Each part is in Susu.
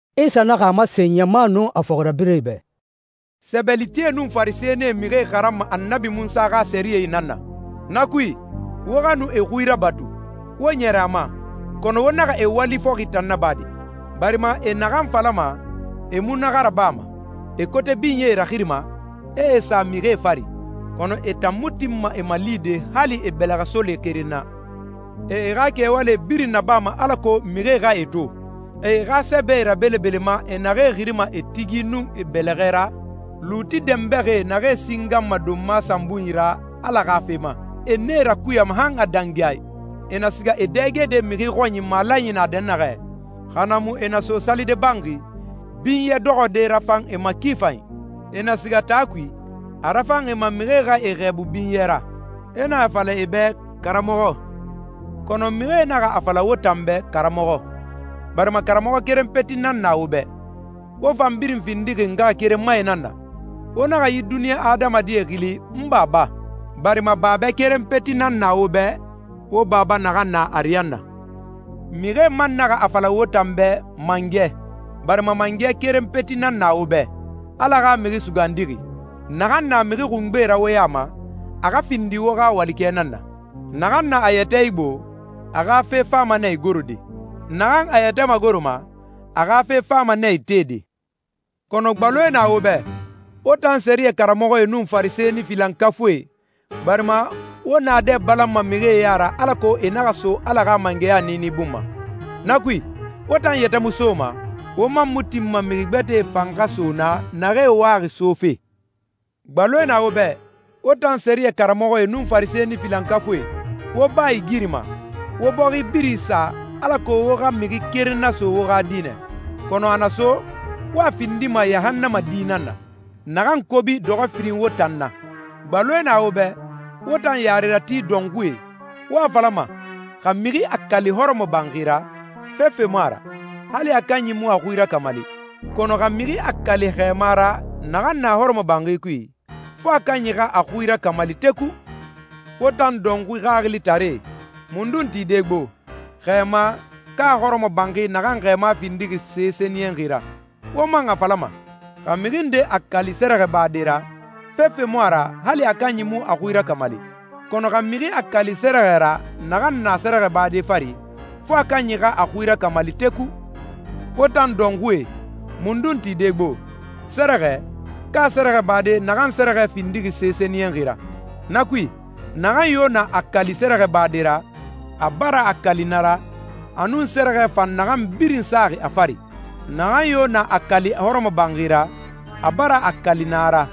Isa naxa a masen ɲama nun a fɔxirabirɛe bɛ, «Sɛbɛlitie nun Farisɛnie mixie xaranma Annabi Munsa xa sɛriyɛ nan na. Na kui, wo xa nu e xui rabatu, wo ɲɛrɛ a ma. Kɔnɔ wo naxa e wali fɔxi tan naba de, barima e naxan falama, e mu na xa rabama. E kote binyee raxirima, e e sa mixie fari, kɔnɔ e tan mu tinma e malide hali e bɛlɛxɛsole keren na. E e xa kɛwalie birin nabama alako mixie xa e to. E e xa sɛbɛe rabelebelema e naxee xirima e tigi nun e bɛlɛxɛ ra. Luuti dɛnbɛxie naxee singanma donma sanbunyi ra Ala xa fe ma, e nee rakuyama han a dangi a i. E na siga e dɛgede mixi xɔnyi malanyi na dɛnnaxɛ, xa na mu e na so salide banxi, binyɛ dɔxɔde rafan e ma ki fanyi. E na siga taa kui, a rafan e ma mixie xa e xɛɛbu binyɛ ra, e na a fala e bɛ, ‹Karamɔxɔ.›» «Kɔnɔ mixie naxa a fala wo tan bɛ ‹Karamɔxɔ,› barima karamɔxɔ keren peti nan na wo bɛ, wo fan birin findixi ngaxakerenmae nan na. Wo naxa yi duniɲa adamadi xili ‹N Baba,› barima Babɛ keren peti nan na wo bɛ, wo Baba naxan na ariyanna. Mixie man naxa a fala wo tan bɛ ‹Mangɛ,› barima Mangɛ keren peti nan na wo bɛ, Ala xa Mixi Sugandixi. Naxan na mixi xungbe ra wo ya ma, a xa findi wo xa walikɛ nan na. Naxan na a yɛtɛ igbo, a xa fe fama nɛ igorode. Naxan a yɛtɛ magoroma, a xa fe fama nɛ itede.» «Kɔnɔ gbaloe na wo bɛ, wo tan sɛriyɛ karamɔxɔe nun Farisɛni filankafuie, barima wo naadɛ balanma mixie ya ra alako e naxa so Ala xa mangɛya niini bun ma. Na kui, wo tan yɛtɛ mu soma, wo man mu tinma mixi gbɛtɛe fan xa so naa naxee waxi sofe.» «Gbaloe na wo bɛ, wo tan sɛriyɛ karamɔxɔe nun Farisɛni filankafuie! Wo baa igirima, wo bɔxi birin isa alako wo xa mixi keren naso wo xa dinɛ, kɔnɔ a na so, wo a findima yahannama di nan na, naxan kobi dɔxɔ firin wo tan na.» «Gbaloe na wo bɛ, wo tan yarerati dɔnxuie! Wo a falama, ‹Xa mixi a kali hɔrɔmɔbanxi ra, fefe mu a ra, hali a kanyi mu a xui rakamali. Kɔnɔ xa mixi a kali xɛɛma ra naxan na hɔrɔmɔbanxi kui, fo a kanyi xa a xui rakamali teku.› Wo tan dɔnxui xaxilitaree! Mundun tide gbo, xɛɛma, ka hɔrɔmɔbanxi naxan xɛɛma findixi se sɛniyɛnxi ra? Wo man a falama, ‹Xa mixi nde a kali sɛrɛxɛbade ra, fefe mu a ra hali a kanyi mu a xui rakamali. Kɔnɔ xa mixi a kali sɛrɛxɛ ra naxan na sɛrɛxɛbade fari, fo a kanyi xa a xui rakamali teku.› Wo tan dɔnxuie! Mundun tide gbo, sɛrɛxɛ, ka sɛrɛxɛbade naxan sɛrɛxɛ findixi se sɛniyɛnxi ra? Na kui, naxan yo na a kali sɛrɛxɛbade ra, a bara a kali na ra, a nun sɛrɛxɛ fan naxan birin saxi a fari. Naxan yo na a kali hɔrɔmɔbanxi ra, a bara a kali na ra,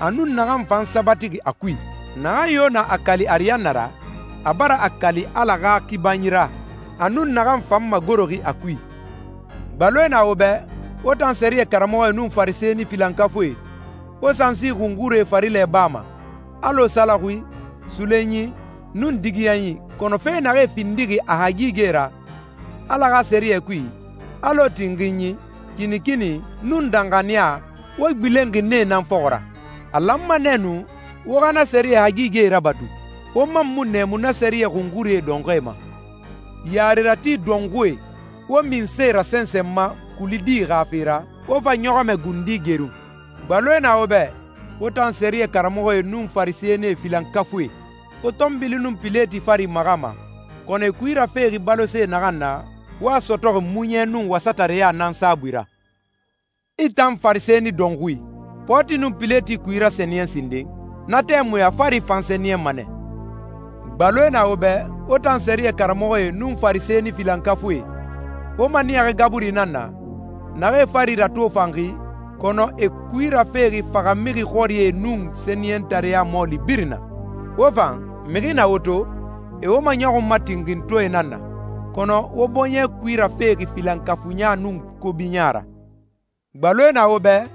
a nun naxan fan sabatixi a kui. Naxan yo na a kali ariyanna ra, a bara a kali Ala xa kibanyi ra, a nun naxan fan magoroxi a kui.» «Gbaloe na wo bɛ, wo tan sɛriyɛ karamɔxɔe nun Farisɛni filankafuie! Wo sansi xunxurie farilɛ bama, alɔ salaxui, suloɲi, nun digiyanyi, kɔnɔ fe naxee findixi a hagigɛe ra Ala xa sɛriyɛ kui, alɔ tinxinyi, kinikini, nun danxaniya, wo gbilenxi nee nan fɔxɔ ra. A lanma nɛ nu wo xa na sɛriyɛ hagigɛe rabatu, wo man mu nɛɛmu na sɛriyɛ xunxurie dɔnxɔɛe ma. Yarerati dɔnxuie! Wo minse rasɛnsɛnma kuli di xa fe ra, wo fa ɲɔxɔmɛ gundi gerun!» «Gbaloe na wo bɛ, wo tan sɛriyɛ karamɔxɔe nun Farisɛnie filankafuie! Wo pɔɔti nun pileti fari maxama, kɔnɔ e kui rafexi balose naxan na, wo a sɔtɔxi muɲɛ nun wasatareya nan saabui ra. I tan farisɛni dɔnxui! Pɔɔti nun pileti kui rasɛniyɛn sinden, na tɛmui a fari fan sɛniyɛnma nɛ.» «Gbaloe na wo bɛ, wo tan sɛriyɛ karamɔxɔe nun Farisɛni filankafuie! Wo maniyaxi gaburie nan na, naxee fari ratofanxi, kɔnɔ e kui rafexi faxamixi xɔrie nun sɛniyɛntareɲa mɔɔli birin na. Wo fan, mixi na wo to, e wo maɲɔxunma tinxintɔɛe nan na, kɔnɔ wo bɔɲɛ kui rafexi filankafuiɲa nun kobiɲa ra.» «Gbaloe na wo bɛ,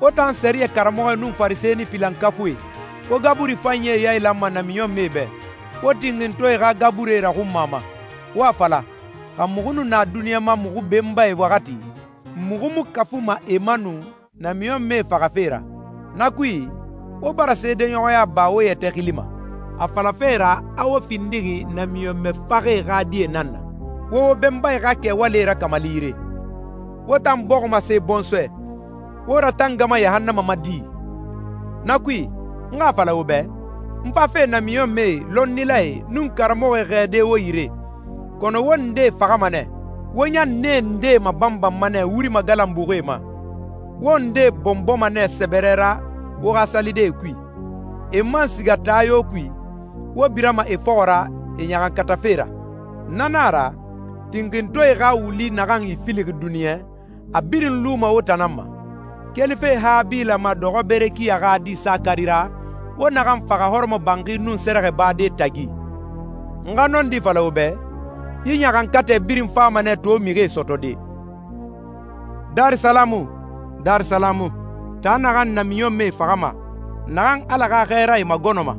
wo tan sɛriyɛ karamɔxɔe nun Farisɛni filankafuie! Wo gaburi fanyie yailanma namiɲɔnmɛe bɛ, wo tinxintɔɛe xa gaburie raxunmama, wo a fala, ‹Xa muxu nu na duniɲa ma muxu benbae waxati, muxu mu kafuma e ma nu namiɲɔnmɛe faxafe ra.› Na kui, wo bara seedeɲɔxɔya ba wo yɛtɛ xili ma, a falafe ra a wo findixi namiɲɔnmɛ faxɛe xa die nan na. Wo wo benbae xa kɛwalie rakamali yire! Wo tan bɔximase bɔnsɔɛ, wo ratangama yahannama ma di?» «Na kui, n xa a fala wo bɛ, n fafe namiɲɔnmɛe, lɔnnilae, nun karamɔxɔe xɛɛde wo yire, kɔnɔ wo ndee faxama nɛ, wo ɲan nee ndee mabanbanma nɛ wuri magalanbuxie ma. Wo ndee bɔnbɔma nɛ sɛbɛrɛ ra wo xa salidee kui, e man siga taa yo kui, wo birama e fɔxɔ ra e ɲaxankatafe ra. Na nan a ra, tinxintɔɛe xa wuli naxan ifilixi duniɲɛ, a birin luma wo tan nan ma, kelife Habila ma dɔxɔ Berekiya xa di Sakari ra, wo naxan faxa hɔrɔmɔbanxi nun sɛrɛxɛbade tagi. N xa nɔndi fala wo bɛ, yi ɲaxankatɛ birin fama nɛ to mixie sɔtɔde.» «Darisalamu, Darisalamu, taa naxan namiɲɔnmɛe faxama, naxan Ala xa xɛɛrae magɔnɔma.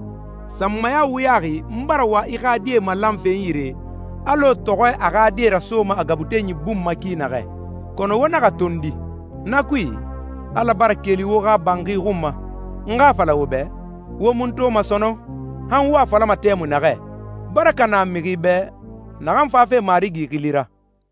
Sanmaya wuyaxi n bara wa i xa die malanfe n yire, alɔ tɔxɔɛ a xa die rasoma a gabutenyi bun ma ki naxɛ, kɔnɔ wo naxa tondi! Na kui, Ala bara keli wo xa banxi xun ma. N xa a fala wo bɛ, wo mu n toma sɔnɔn, han wo a falama tɛmui naxɛ, ‹Baraka na mixi bɛ naxan fafe Marigi xili ra!›»